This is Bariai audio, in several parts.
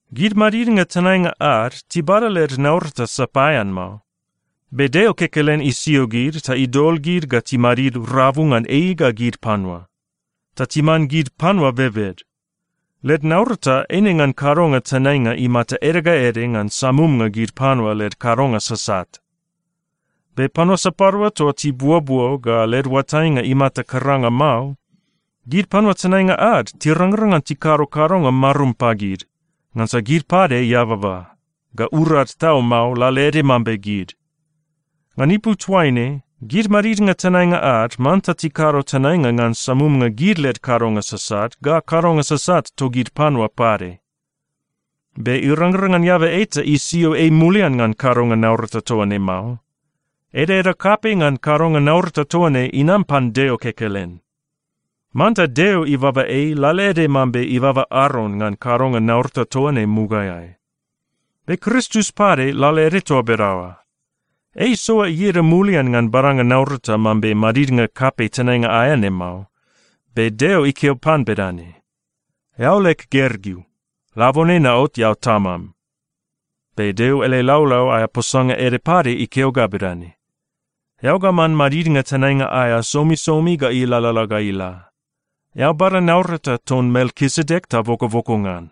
Gid madidnga tenainga ad tibada led naurata sapaean mao. Be Deo kekelen isio gid ta idol gid ga timadid rabu ngan ei ga gid panua, ta timan gid panua bebed. Led naurata eine ngan kadonga tenainga imata ede ga ede ngan samumnga gid panua led kadonga sasat. Be panua sapadua toa tibuobuo ga led oatainga imata karanga mao, gid panua tenainga ad tirangrang ngan tikado kadonga marum pagid, ngansa gid pade eababa, ga urad tau mao lalaede mambe gid. Ngan ipu toaine, gid madidnga tenainga ad manta tikado tenainga ngan samumnga gid led kadonga sasat ga kadonga sasat togid panua pade. Be irangrang ngan eaba eta isio ei mulian ngan kadonga naurata toa ne mao. Edaeda kapei ngan kadonga naurata toa ne inam pan Deo kekelen. Manta Deo ibaba ei lalaede mambe ibaba Aron ngan kadonga naurata toa ne mugaeai. Be Kristus pade lalaede toa bedaoa. Ei isoa ieda mulian ngan badanga naurata mambe madidnga kapei tenainga aea ne mao. Be Deo ikeo pan bedane, “Eao leg Gergeu. Labone naot eao Tamam.” Be Deo ele laulau aea posanga ede pade ikeo ga bedane, “Eao ga man madidnga tenainga aea somisomi ga ilalala ga ila. Eao bada naurata ton Melkisedek ta bokoboko ngan.”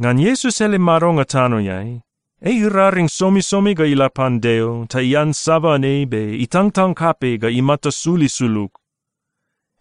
Ngan Iesus ele madonga tanoeai, ei iraring somisomi ga ila pan Deo ta iansaban ei be itangtang kapei ga imata sul isulug.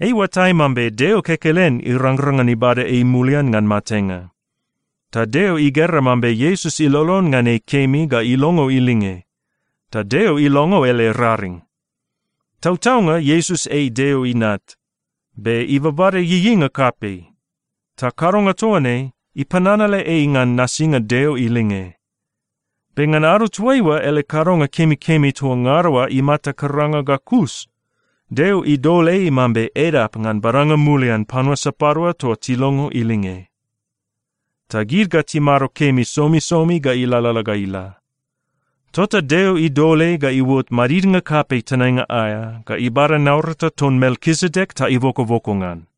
Ei iuatai mambe Deo kekelen irangrang ngan ibada ei mulian ngan matenga. Ta Deo igera mambe Iesus ilolon ngan ei kemi ga ilongo ilinge, ta Deo ilongo ele raring. Tautaunga Iesus ei Deo Inat, be ibabada ieieinga kapei. Ta kadonga toa ne ipananale ei ngan nasinga Deo ilinge. Be ngan ado toaiua ele kadonga kemikemi toa ngada oa imata karanga ga kus, Deo idol ei mambe edap ngan badanga mulian panua sapadua toa tilongo ilinge. Ta gid ga timado kemi somisomi ga ilalala ga ila. Tota Deo idol ei ga iuot madidnga kapei tenainga aea ga ibada naurata ton Melkisedek ta ibokoboko ngan.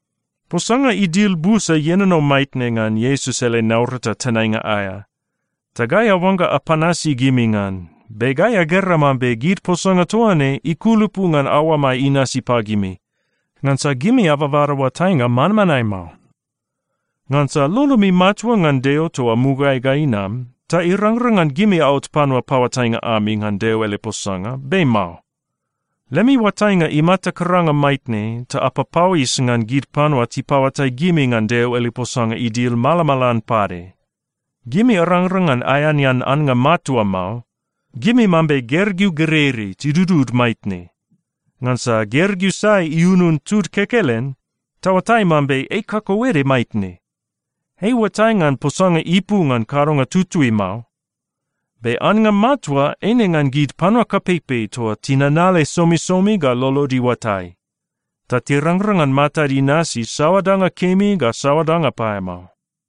Posanga idil busa ienono maitne ngan Iesus ele naurata tenainga aea, ta gai aoangga apanasi gimi ngan, be gai agera mambe gid posanga toa ne ikulupu ngan aoamai inasi pagimi, ngansa gimi ababada oatainga manmanae mao. Ngansa lolomi matua ngan Deo toa mugaeai ga inam, ta irangrang ngan gimi aot panua paoatainga ami ngan Deo ele posanga, be mao. Lemi oatainga imata karanga maitne ta apapauis ngan gid panua tipaoatai gimi ngan Deo ele posanga idil malamalan pade. Gimi arangrang ngan aeanean annga matua mao. Gimi mambe gergeu gereirei tidudud maitne. Ngansa gergeu sai iunun tud kekelen, taoatai mambe ei kakauede maitne. Ei iuatai ngan posanga ipu ngan kadonga tutui mao. Be annga matua eine ngan gid panua kapeipei toa tinanale somisomi ga lolod iuatai, ta tirangrang ngan matad inasi saoa danga kemi ga saoa danga paeamao.